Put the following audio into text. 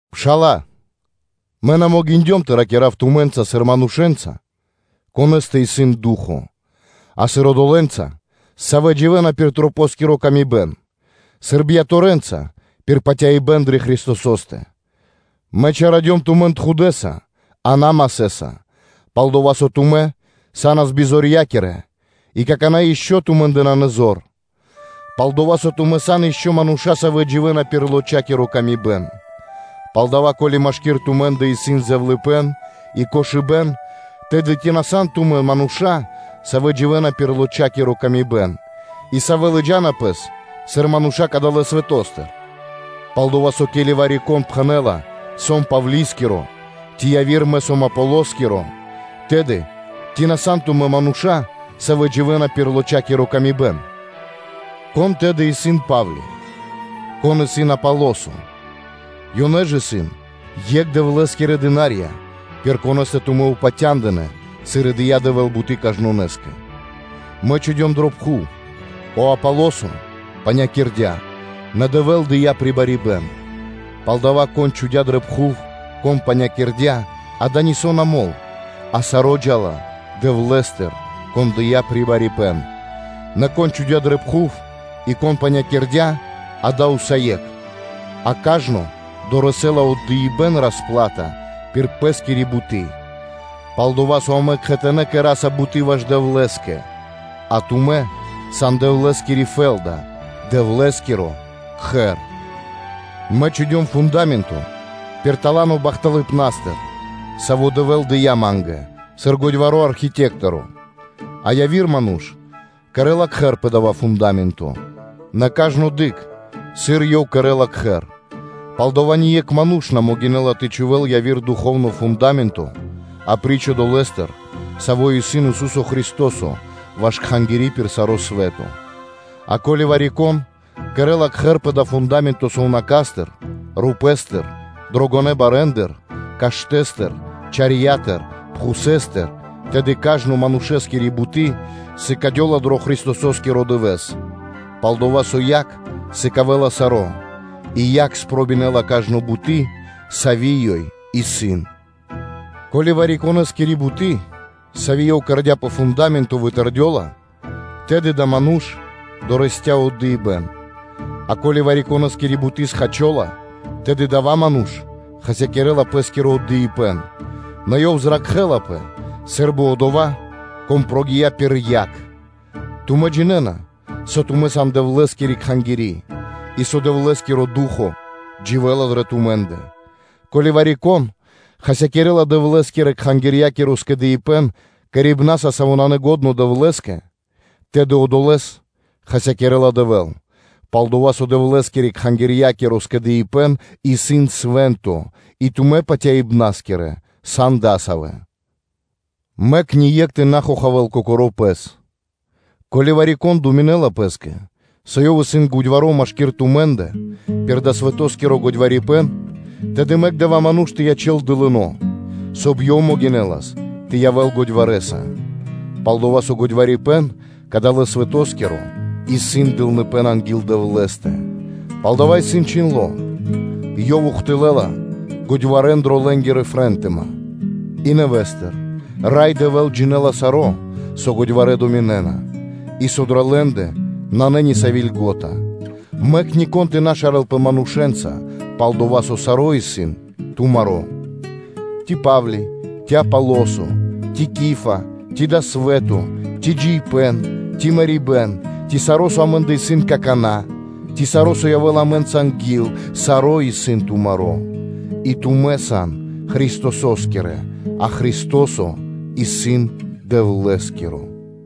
Пшала́лэ, мэ на могиндём тэ ракира́в тумэ́нца сыр манушэ́нца, конэ́стэ исын Ду́хо (Фа́но), а сыр одолэнца, савэ́ дживэ́на пир лочакиро (плотякиро) тырдыпэ́н, сыр бияторэнца (чхаворэнца) пир патяибэ́н дрэ Христосо́стэ. Мэ чалякирдём тумэн тхудэ́са, а на масэ́са, пал-дова́ со тумэ́ са́нас бизорья́кирэ, и какана́ ишчо (инкэ́) тумэ́ндэ нанэ зор; пал-дова́ со тумэ́ сан ишчо (инкэ́) мануша́, савэ́ дживэ́на пир лочакиро тырдыпэ́н. Палдава́, ко́ли машки́р тумэ́ндэ исын зэвлыныпэ́н, и кошыбэ́н, тэды, ци на сан тумэ́ мануша́, савэ́ дживэ́на пир лочакиро (плотякиро) тырдыпэ́н; и савэ́ лыджа́на пэс сыр мануша́ кадалэ́ свэто́стыр? Пал-дова́ со, ке́ли вари-кон пхэнэ́ла: “Мэ сом Павли́скиро”, ци яви́р: “Мэ сом Аполососкиро”, тэды, ци на сан тумэ́ мануша́, савэ́ дживэ́на пир лочакиро тырдыпэ́н? Кон тэды исын Па́вли? Кон исын Аполосо? Ёнэ ж исын екх Дэвлэ́скирэ слу́ги (дына́рья), пир конэ́стэ тумэ́ упатя́ндынэ, сыр и дыя́ Дэвэ́л буты́ кажнонэ́скэ (сваконэскэ). Мэ чхудём дрэ пхув, о Аполосо панякирдя, нэ Дэвэ́л дыя́ прибарипэн. Палдава́, кон чхудя́ дрэ пхув, кон панякирдя, дава́ нисо́ на мол, а саро́ джа́ла Дэвлэ́стыр, Кон дыя́ прибарипэн. Нэ кон чхудя́ дрэ пхув, и кон панякирдя-дава́ усае́кх, а кажно дорэсэ́ла (долэла) отдыибэ́н пир пэ́скири буты́. Пал-дова́ со амэ кхэтанэ́ кэра́са буты́ ваш Дэвлэ́скэ, а тумэ́, сан Дэвлэ́скири фэ́лда, Дэвлэ́скиро Кхэр. Мэ чхудём фунда́менто пир тала́но (дарованиё) бахталыпнастыр, саво́ Дэвэ́л дыя́ ма́нгэ сыр годьваро́ архитекторо, а яви́р ману́ш кэрэ́ла кхэр пэ дава́ фунда́менто. Нэ кажно дыкх, сыр ёв кэрэ́ла кхэр. Палдава́ ние́кх ману́ш на могинэ́ла тэ чхувэ́л яви́р духовно фунда́менто апри́ч одолэ́стэ, саво́ исын Ису́со Христо́со ваш кхангири́ пир саро́ свэ́то. А ко́ли вари-кон кэрэ́ла кхэр пэ дава́ фунда́менто сувнака́стыр, рупэ́стыр, дрогонэ́ барэндыр, каштэ́стыр, чарьятыр, пхусэстыр, тэды кажно манушэскири буты́ сыкадёла дро Христосо́скиро дывэ́с, пал-дова́ со яг сыкавэ́ла саро́, и яг спробинэла кажно буты́, сави́ ёй исын. Ко́ли вари-конэ́скири буты́, сави́ ёв кэрдя́ пэ дава́ фунда́менто, вытэрдёла, тэды адава́ ману́ш дорэсця́ отдыибэ́н. А ко́ли вари-конэ́скири буты́ схачола, тэды адава́ ману́ш хасякирэ́ла пэ́скиро отдыибэ́н, нэ ёв зракхэ́лапэ сы́рбы одова́, кон прогия́ пир яг. Тумэ́ джинэ́на, со тумэ́ сан Дэвлэ́скири Кхангири́, и со Дэвлэ́скиро Ду́хо (Фа́но) дживэ́ла дрэ тумэ́ндэ. Ко́ли вари-кон хасякирэ́ла Дэвлэ́скирэ-кхангирья́киро скэдыибэ́н кэрибнаса, саво́ нанэ лачхо́ Дэвлэ́скэ, тэды одолэ́с хасякирэ́ла Дэвэ́л; пал-дова́ со Дэвлэ́скирэ-кхангирья́киро скэдыибэ́н исын свэ́нто и тумэ́ патяибнаскирэ, сан дасавэ́. Мэк ние́кх тэ на хохавэ́л кокоро́ пэс; ко́ли вари-кон думинэ́ла пэ́скэ, со ёв исын годьваро́ машки́р тумэ́ндэ пир дава́ свэтоскиро годьварипэн, тэды мэк адава́ ману́ш тэ ячэ́л дылынэса, соб (кай) ёв могинэлас тэ явэ́л годьварэса. Пал-дова́ со годьварипэн кадалэ́ свэтоскиро исын дылныпэ́н анги́л Дэвлэ́стэ; палдава́ исын чхиндло́: “Ёв ухтылэ́ла годьварэн дро лэ́нгири фротыма.” И нэвэ́стыр: “Рай Дэвэ́л джинэ́ла саро́, со годьварэ́ думинэ́на, и со дрэ лэ́ндэ нанэ ни сави́ льго́та.” Мэк нико́н тэ на шарэлпэ манушэ́нца; пал-дова́ со саро́-исын тумаро́. Ци Па́вли, ци Аполосо, ци Кифа, ци дава́ свэ́то, ци джиибэ́н, ци мэрибэ́н, ци саро́, со амэ́ндэ исын какана́; ци саро́, со явэ́ла амэ́нца анги́л, саро́-исын тумаро́: и тумэ́ сан Христосо́скирэ, а Христо́со исын Дэвлэ́скиро.